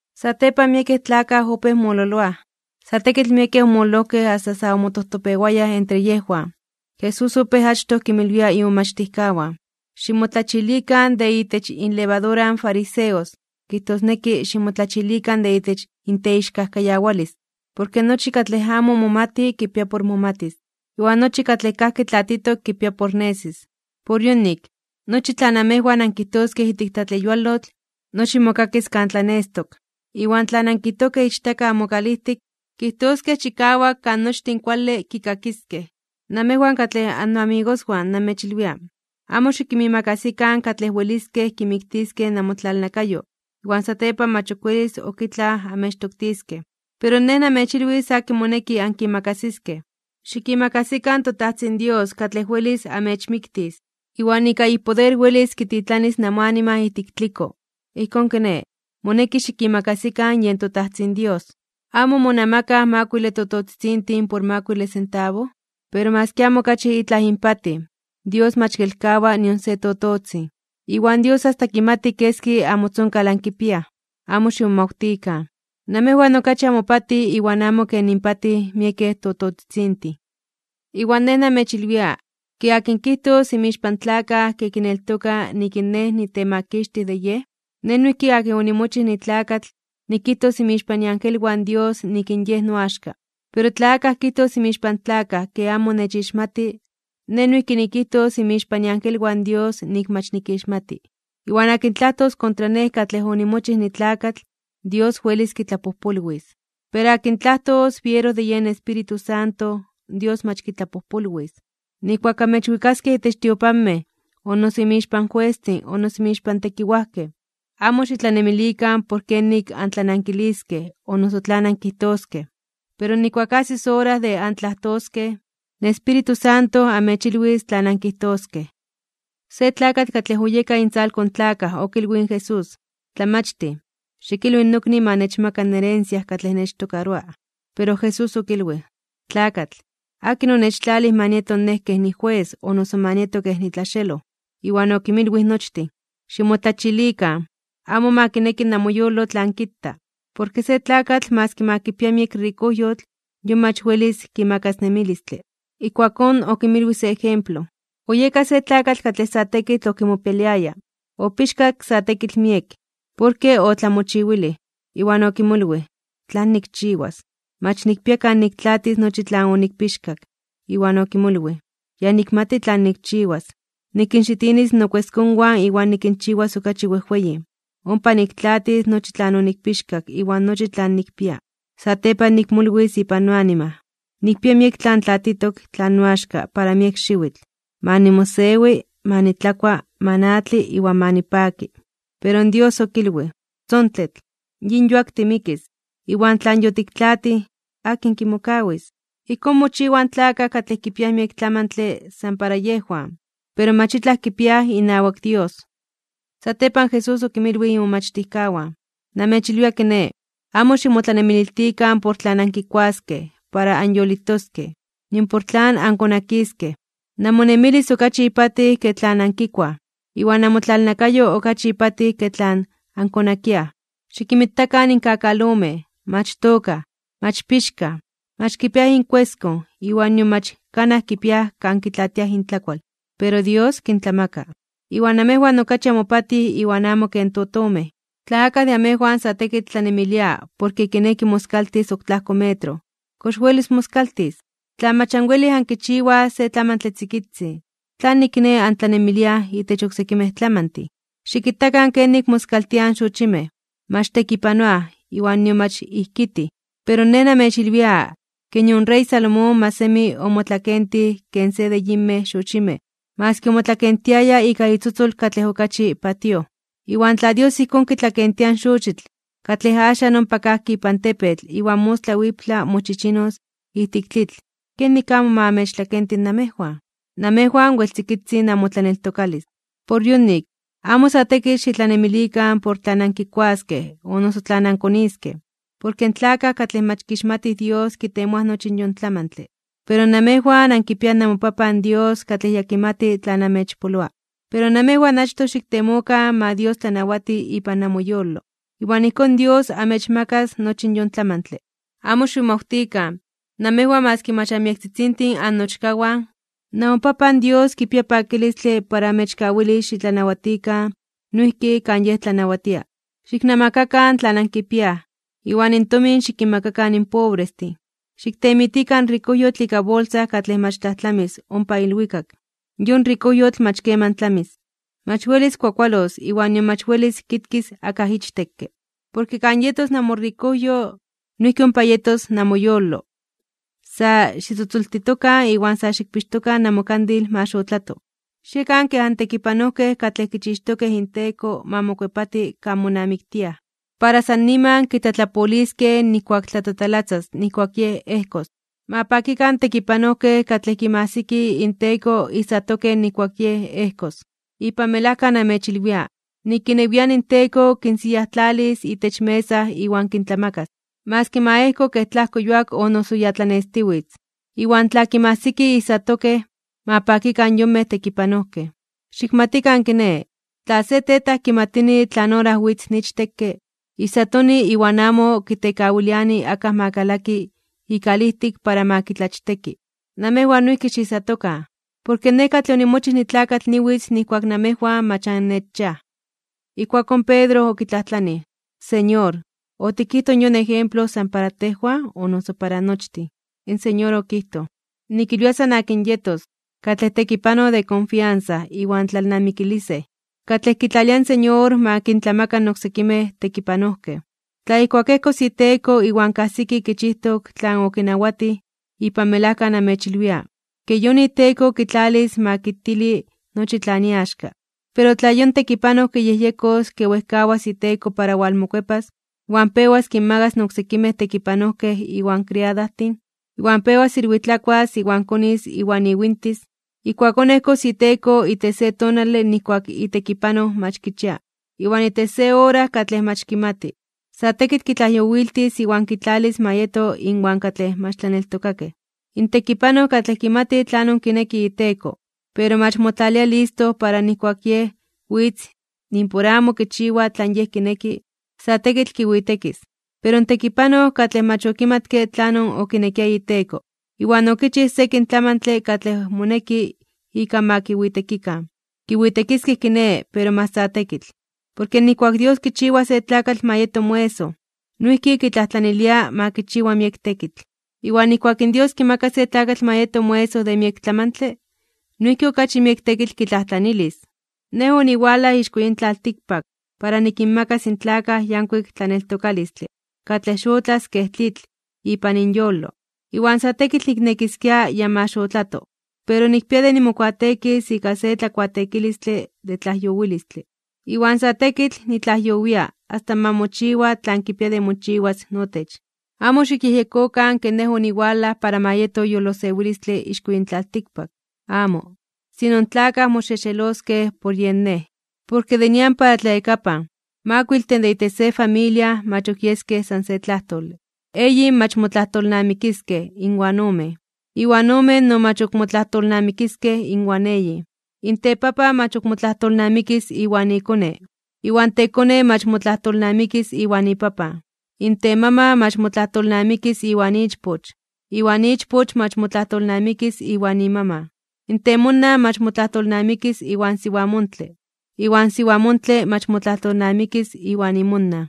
Satepan miekej tlakaj opéj mololoaj, sa tekitl miekej omololojkej asta sa omotojtopewayaj entre yejwan. Jesús opéj achtoj kinmilwia imomachtijkawan: ―Ximotlachilikan de itech inlevadura in fariseos, kijtosneki, ximotlachilikan de itech inteixkajkayawalis. Porke nochi katlej amo momati kipia por momatis, iwan nochi katlej kajki tlatitok kipia por nesis. Por yonik, nochi tlan amejwan ankijtojkej ijtik tlatleyualotl, nochi mokakis kan tlanestok. Iwan tlan ankijtojkej ichtaka amokalijtik, kijtoskej chikawak kan nochtin kuale kikakiskej. ’Namejwan katlej annoamigoswan namechilwia, amo xikinmiimakasikan katlej weliskej kimiktiskej namotlalnakayo, iwan satepan mach ok welis ok itlaj amechtoktiskej. Pero Nej namechilwis akin moneki ankimakasiskej: xikimakasikan toTajtzin Dios katlej welis amechmiktis, iwan ika ipoder welis kititlanis namoanima ijtik tliko. Ijkón kiné, moneki xikimakasikan yen toTajtzin Dios. ’¿Amo monamakaj makuile tototzitzintin por makuile sentabo? Pero maski amo okachi itlaj inpatij, Dios mach kelkawa nion se tototzin. Iwan Dios asta kimati keski amotzonkal ankipiaj. Amo ximomawtikan. Namejwan okachi amopatij iwan amo ken inpatij miekej tototzitzintin. ’Iwan nej namechilwia, ke akin kijtos inmixpan tlakaj ke kineltoka nik in Nej nitemakixtij de yej, Nej noijki akin onimochij nitlakatl, nikijtos inmixpan iangelwan Dios nik in yej noaxka. Pero tla akaj kijtos inmixpan tlakaj ke amo nechixmati, Nej noijki nikijtos inmixpan iangelwan Dios nik mach nikixmati. ’Iwan akin tlajtos kontra Nej katlej onimochij nitlakatl, Dios welis kitlapojpolwis. Pero akin tlajtos biero de yen Espíritu Santo, Dios mach kitlapojpolwis. ’Nijkuak amechwikaskej itech tiopanmej, o noso inmixpan juestin o noso inmixpan tekiwajkej, amo xitlanemilikan por kenik antlanankiliskej o noso tlan ankijtoskej. Pero nijkuak ajsis ora de antlajtoskej, in Espíritu Santo amechilwis tlan ankijtoskej. Se tlakatl katlej oyeka intzalko in tlakaj okilwij in Jesús: ―Tlamachtij, xikilwi nokni ma nechmaka in herencia katlej nechtokaroa. Pero Jesús okilwij: ―Tlakatl, ¿akin onechtlalij ma nieto Nej kej nijues o noso ma nieto kej nitlaxeloj? Iwan okinmilwij nochtin: ―Ximotlachilikan, amo ma kineki namoyolo tlan kita. Porke se tlakatl maski ma kipia miek rikojyotl yon mach welis kimakas nemilistle. Ijkuakón okinmilwij se ejemplo: ―Oyeka se tlakatl katlej sa tekitl okimopialiaya, opixkak sa tekitl miek, porke otlamochiwilij. Iwan okimolwij: “¿Tlan nikchiwas? Mach nikpia kan niktlaatis nochi tlan onikpixkak.” Iwan okimolwij: “Ya nikmati tlan nikchiwas. Nikinxixinis nokueskonwan iwan nikinchiwas okachi wejweyin, ompa niktlaatis nochi tlan onikpixkak iwan nochi tlan nikpia. Satepan nikmolwis ipan noanima: Nikpia miek tlatitok tlan noaxka para miek xiwitl, ma nimosewi, ma nitlakua, ma natli, iwan ma nipaki.” Pero in Dios okilwij: “¡Tzontetl! Yin yuak timikis, iwan tlan yotiktlaatij, ¿akin kimokawis?” Ijkón mochiwaj in tlakaj katlej kipiaj miek tlamantle san para yejwan, pero mach itlaj kipiaj inawak Dios. Satepan Jesús okinmilwij imomachtijkawan: ―Namechilwia, kiné, amo ximotlanemililtikan por tlan ankikuaskej para anyolitoskej, nion por tlan ankonakiskej. Namonemilis okachi ipatij ke tlan ankikuaj, iwan namotlalnakayo okachi ipatij ke tlan ankonakiaj. Xikinmitakan in kakalomej, mach tookaj, mach pixkaj, mach kipiaj inkueskon iwan nion mach kanaj kipiaj kan kitlaatiaj intlakual. Pero Dios kintlamaka. Iwan namejwan okachi amopatij iwan amo ken totomej. Tla akaj de amejwan sa tekitl tlanemilia porke kineki moskaltis ok tlajko metro, ¿kox welis moskaltis? Tla mach anwelij ankichiwaj se tlamantle tzikitzin, ¿tlanik, kiné, antlanemiliaj itech oksekimej tlamantin? ’Xikitakan kenik moskaltiaj in xochimej, mach tekipanoaj iwan nion mach ijkitij (tlajtzomaj). Pero Nej namechilwia ke nion rey Salomón mach semi omotlakentij ken se de yinmej xochimej maski omotlakentiaya ika itzotzol katlej okachi patíoj. Iwan tla Dios ijkón kitlakentia in xochitl, katlej axan ompa kajki ipan tepetl iwan mostla wiptla mochichinos ijtik tlitl, ¿kenik amo ma amechtlakenti namejwan? ¡Namejwan wel tzikitzin namotlaneltokalis! Por yonik, amo sa tekitl xitlanemilikan por tlan ankikuaskej o noso tlan ankoniskej. Porke in tlakaj katlej mach kixmatij Dios kitemoaj nochi in yon tlamantle. Pero namejwan ankipiaj namoPapan Dios katlej ya kimati tlan amechpoloa. Pero namejwan achtoj xiktemokan ma Dios tlanawati ipan namoyolo. Iwan ijkón Dios amechmakas nochi yon tlamantle. ’Amo ximomawtikan, namejwan maski mach anmiektzitzintin annochkawan, namoPapan Dios kipia pakilistle para amechkawilis xitlanawatikan noijki kan Yej tlanawatia. Xiknamakakan tlan ankipiaj, iwan tomin xikinmakakan in pobrestin. Xiktemitikan rikojyotl ika bolsa katlej mach tlajtlamis ompa ilwikak. Yon rikojyotl mach keman tlamis. Mach welis kuakualos iwan nion mach welis kitkis akaj ichtekke. Porke kan yetos namorikojyo, noijki ompa yetos namoyolo. ’Sa xitzotzoltitokan iwan sa xikpixtokan namokandil ma xotlato. Xiekan kej antekipanojkej katlej kichixtokej inteko ma mokuepati kan monamiktiaj, para san niman kitlatlapoliskej nijkuak tlatatalatzas nijkuak yej ejkos. Ma pakikan in tekipanojkej katlej kinmajsiki inteko ijsatokej nijkuak yej ejkos. Ipan melajka namechilwia, nik inewian inteko kinsiyajtlalis itech mesa iwan kintlamakas. Maski ma ejko kej tlajko yuak o noso ya tlanestiwitz, iwan tla kinmajsiki ijsatokej, ma pakikan yonmej tekipanojkej. Xikmatikan kiné, tla se tetaj kimatini tlan ora witz in ichtekke, ijsatoni iwan amo kitekawiliani akaj ma kalaki ikalijtik para ma kitlachteki. Namejwan noijki xiijsatokan. Porke Nej katlej onimochij nitlakatl niwitz nijkuak namejwan mach annechchiaj. Ijkuakón Pedro okitlajtlanij: ―Señor, ¿otikijtoj yon ejemplo san para tejwan, o noso para nochtin? In Señor okijtoj: ―Nikilwia san akin yetos, katlej tekipanoj de konfiansa iwan tlalnamikilisej, katlej kitlalia in Señor ma kintlamaka in oksekimej tekipanojkej. Tla ijkuak ejkos iteko iwan kajsiki kichijtok tlan okinawatij, ipan melajka namechilwia, ke yon iteko kitlalis ma kitili nochi tlan iaxka. Pero tla yon tekipanoj kiyejyekos ke wejkawas iteko para walmokuepas, iwan pewas kinmagas in oksekimej tekipanojkej iwan kriadajtin, iwan pewas ilwitlakuas iwan konis iwan iwintis, ijkuakón ejkos iteko itech se tonale nijkuak itekipanoj mach kichia, iwan itech se ora katlej mach kimati. Sa tekitl kitlajyowiltis iwan kitlalis ma yeto inwan katlej mach tlaneltokakej. ’In tekipanoj katlej kimati tlanon kineki iteko, pero mach motlalia listo para nijkuak yej witz nimpor amo kichiwa tlan yej kineki, sa tekitl kiwitekis. Pero in tekipanoj katlej mach okimatke tlanon okinekia iteko, iwan okinchij sekin tlamantin katlej moneki ika ma kiwitekikan, kiwitekiskej kiné pero mach sa tekitl. Porke nijkuak in Dios kichiwa se tlakatl ma yeto moesoj, noijki kitlajtlanilia ma kichiwa miek tekitl. Iwan nijkuak in Dios kimaka se tlakatl ma yeto moesoj de miek tlamantle, noijki okachi miek tekitl kitlajtlanilis. ’Nej oniwalaj ixko yin tlaltikpak para nikinmakas in tlakaj yankuik tlaneltokalistle katlej xotlas kej tlitl ipan inyolo. Iwan sa tekitl niknekiskia ya ma xotlato. Pero nikpia de nimokuateekis ika se tlakuateekilistle de tlajyowilistle. Iwan sa tekitl nitlajyowia asta ma mochiwa tlan kipia de mochiwas notech. Amo xikyejyekokan ke Nej oniwalaj para ma yeto yolosewilistle ixko yin tlaltikpak. ¡Amo! Sino in tlakaj moxexeloskej por yen Nej. Porke de nian para tlayakapan, makuiltin de itech se familia mach ok yeskej san se tlajtole, eyin mach motlajtolnamikiskej inwan omen, iwan omen no mach ok motlajtolnamikiskej inwan eyin. In tepapan mach ok motlajtolnamikis iwan ikone, iwan tekone mach motlajtolnamikis iwan ipapan. In temaman mach motlajtolnamikis iwan ichpoch, iwan ichpoch mach motlajtolnamikis iwan imaman. In temonan mach motlajtolnamikis iwan siwamontle, iwan siwamontle mach motlajtolnamikis iwan imonan.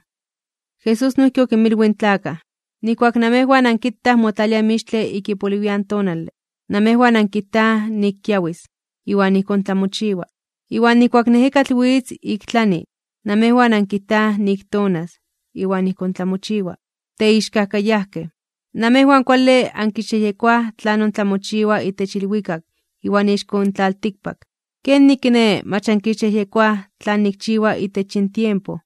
Jesús noijki okinmilwij in tlakaj: ―Nijkuak namejwan ankitaj motlalia in mixtle ik ipoliwian tonale, namejwan ankijtaj nik kiawis, iwan ijkón tlamochiwa. Iwan nijkuak in ejekatl witz ik tlani, namejwan ankijtaj nik tonas, iwan ijkón tlamochiwa. ¡Teixkajkayajkej! Namejwan kuale ankixyejyekoaj tlanon tlamochiwa itech ilwikak iwan ixko in tlaltikpak. ¿Kenik kiné, mach ankixyejyekoaj tlan nikchiwa itech yin tiempo?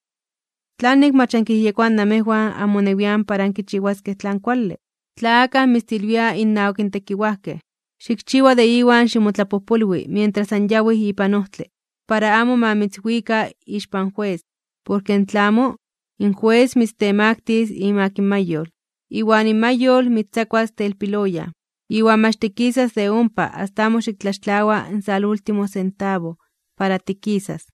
’¿Tlanik mach ankiyejyekoaj namejwan amonewian para ankichiwaskej tlan kuale? Tla akaj mitztilwia innawak tekiwajkej, xikchiwa de iwan ximotlapojpolwi mientras anyawij ipan ojtle, para amo ma mitzwika ixpan jues. Porke in tla amo, in jues mitztemaktis (mitztemaktilis) imak in mayol, iwan mayol mitztzakuas telpiloyan. Iwan mach tikisas de ompa asta amo xiktlaxtlawa in salúltimo sentabo para tikisas.